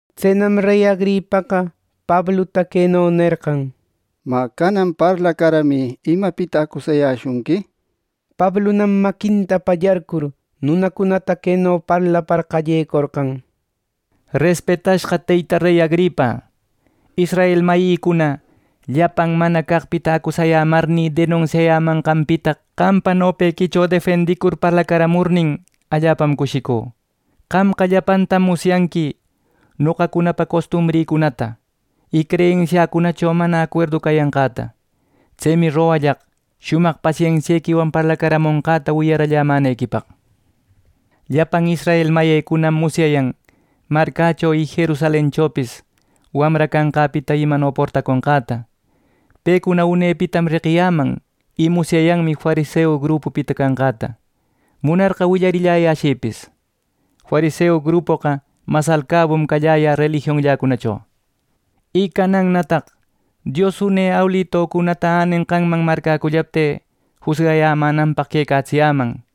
Tsenam rey Agripaqa Pabluta queno nerqan: —Mä, canan parlacaramï imapita acusayäshunqui —nishpa. Pablunam maquinta pallarcur nunacunata queno parlapar qallecorqan: “Respetashqa teyta rey Agripa, israel mayïcuna llapan mana caqpita acusayämarnï denunsiayämanqanpita qampa nopequicho defendicur parlacaramurnin, allapam cushicü. Qamqa llapantam musyanqui noqacunapa costumbrïcunata, y creyensiacunacho mana acuerdu cayanqäta. Tsemi rogallaq shumaq pasensiequiwan parlacaramonqäta wiyarallämänequipaq. Llapan israel mayïcunam musyayan marcächo y Jerusalenchopis wamra cashqäpita imano portaconqäta. Pecuna unepitam reqiyäman, y musyayanmi fariseu grupupita canqäta; munarqa willariyäshïpis. Fariseu grupoqa mas alcabum cayä relijionnïcunacho. Y canannataq Dios une awilücunata änenqanman marcäcullaptï, jusgayämänanpaq quecatsiyäman.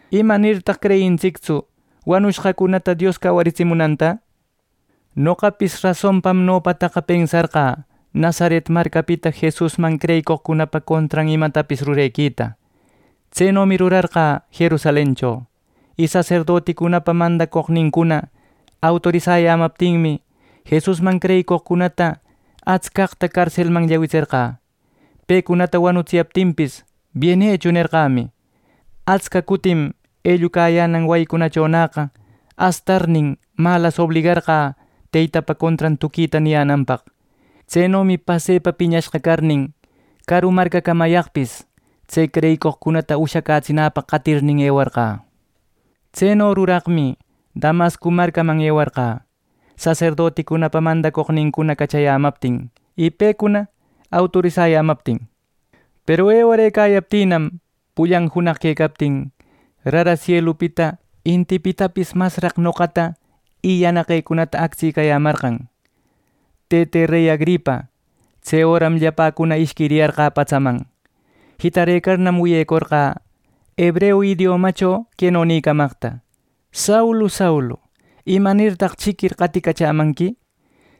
¡Imanirtaq creyintsictsu wanushqacunata Dios cawaritsimunanta! “Noqapis rasonpam nopataqa pensarqä Nazaret marcapita Jesusman creyicoqcunapa contran imecatapis rurequita. Tsenomi rurarqä Jerusalencho. Y saserdoticunapa mandacoqnincuna autorisayämaptinmi, Jesusman creyicoqcunata atscaqta carselman llawitserqä. Pecunata wanutsiyaptinpis ‘¡Bienecho!’ nerqämi. Atsca cutim ellucayänan wayicunachonäqa astarnin, malas obligarqä Teytapa contran tuquita niyänanpaq. Tsenomi pasepa piñashqa carnin, caru marcacamayaqpis tse creyicoqcunata ushacätsinäpaq qatirnin ewarqä. Tseno ruraqmi Damasco marcaman ewarqä, saserdoticunapa mandacoqnincuna cachayämaptin y pecuna autorisayämaptin. Peru ewarëcayaptinnam, pullan junaq quecaptin, rara sielupita intipitapis masraq noqata y yanaqecunata actsicayämarqan, tëte rey Agripa. Tse öram llapäcuna ishquiriyarqä patsaman. Jitarëcarnam, wiyecorqä hebreu idiomacho queno nïcamaqta: ‘Saulu, Saulu ¿Imanirtaq chiquir qaticachämanqui?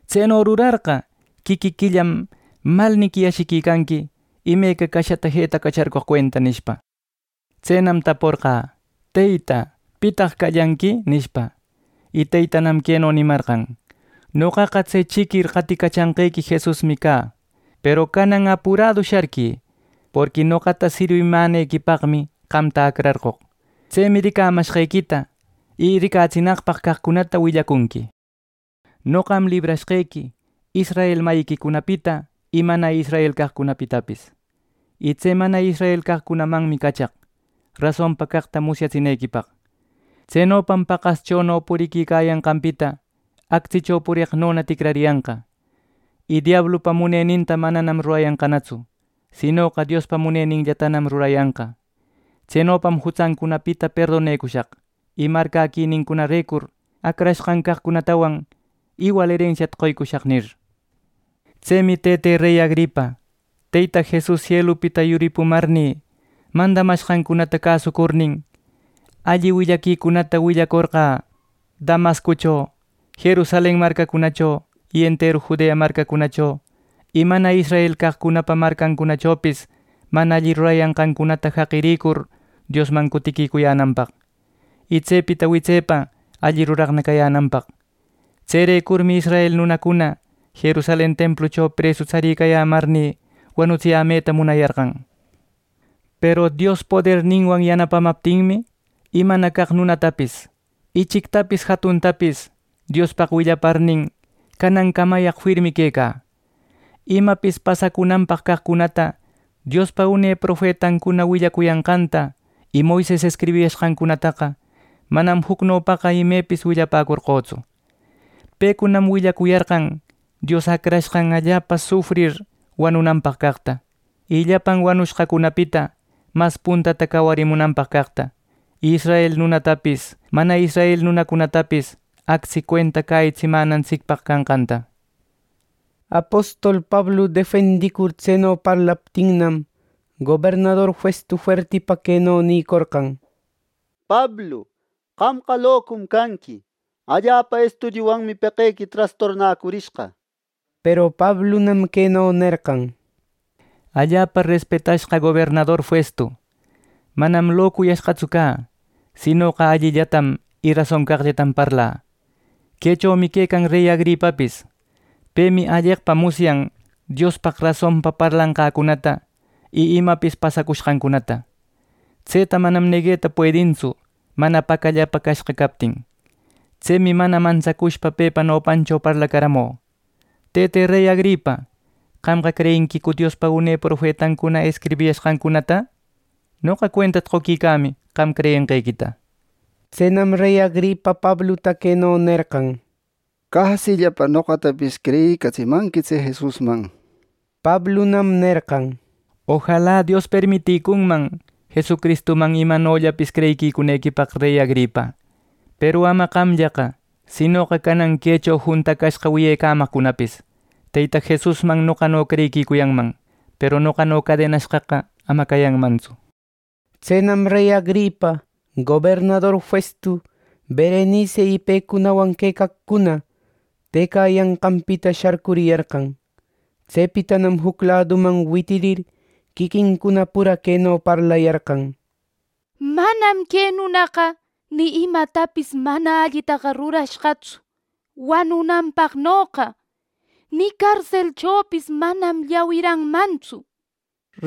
Tseno rurarqa, quiquiquillam malniqui ashiquicanqui imeca cashata jetacacharcoq cuenta’ nishpa. Tsenam taporqä: ‘Teyta, pitaq callanqui’ nishpa. Y Teytanam queno nimarqan: ‘Noqaqa tse chiquir qaticachanqequi Jesusmi cä. Peru canan apuradu sharquï. Porqui noqata sirwimänequipaqmi qamta acrarqoq. Tsemi ricamashqequita y ricatsinaqpaq caqcunata willacunqui. Noqam librashqequi israel mayiquicunapita y mana israel caqcunapitapis. Y tse mana israel caqcunamanmi cachaq, rasonpa caqta musyatsinequipaq. Tsenopam paqaschono puriquicayanqanpita actsicho pureqnona ticrariyanqa, y diablupa muneninta manam rurayanqanatsu, sinoqa Diospa muneninllatanam rurayanqa. Tsenopam jutsancunapita perdonecushaq y marcäquinincunarecur acrashqan caqcunatawan iwal erensiata qoycushaq’ nir. “Tsemi Tëte rey Agripa, Teyta Jesus sielupita yuripumarnï mandamashqanta cäsucurnin, alli willaquicunata willacorqä Damasco y Jerusalen marcacunacho, enteru Judea marcacho y mana israel caqcunapa marcacunachopis mana alli rurayashqancunata jaqirïcur Diosman cutiquicuyänanpaq, y tsepita witsepa alli ruraqna cayänanpaq. Tserecurmi israel nunacuna Jerusalen templucho presu tsaricayämarnï, wanutsiyämeta munayarqan. Peru Dios poderninwan yanapamaptinmi, imana caq nunatapis ichictapis jatuntapis Diospaq willaparnin, canancamayaq firmi quecä. Imapis pasacunanpaq caqcunata Diospa une profetancuna willacuyanqanta y Moises escribishqancunataqa manam jucnopaqa imepis willapäcorqötsu. Pecunam willacuyarqan Dios Acrashqan allapa sufrir wanunanpaq caqta, y llapan wanushqacunapita mas puntata cawarimunanpaq caqta, y israel nunatapis mana israel nunatapis actsi cuenta cäyitsimänantsicpaq canqanta.” Apostol Pablu defendicur tseno parlaptinnam, gobernador Festu fuertipa queno nicorqan: —¡Pablu, qamqa locum canqui! Allapa estudiuwanmi peqequi trastornacurishqa —nishpa. Peru Pablunam queno nerqan: —Allapa respetashqa gobernador Festu, manam locuyashqatsu cä, sinoqa allillatam y rason caqllatam parlä. Quechomi quecan rey Agripapis. Pemi alleqpa musyan Diospaq rasonpa parlanqäcunata y imapis pasacushqancunata. Tseta manam negueta puedintsu mana pacallapa cashqa captin. Tsemi mana mantsacushpa pepa nopancho parlacaramü. Tëte rey Agripa, ¿qamqa creyinquicu Diospa une profetancuna escribiyashqancunata? Noqa cuentata qoquicämi qam creyenqequita. Tsenam rey Agripa Pabluta queno nerqan: —Casillapa noqatapis creyïcatsimanqui tse Jesusman. Pablunam nerqan: —Ojala Dios permiticunman Jesucristuman imanollapapis creyiquicunequipaq, rey Agripa. Peru ama qamllaqa sinoqa canan quecho juntacashqa wiyecamaqcunapis Teyta Jesusman noqano creyiquicunman. Peru noqano cadenashqaqa ama cayanmantsu. Tsenam rey Agripa, gobernador Festu, Berenici y pecunawan quecaqcuna, tëcayanqanpita sharcuriyarqan. Tsepitanam juc laduman witirir, quiquincuna pura queno parlayarqan: —Manam que nunaqa ni imatapis mana allitaqa rurashqatsu wanunanpaqnoqa, ni carselchopis manam llawiranmantsu —nishpa.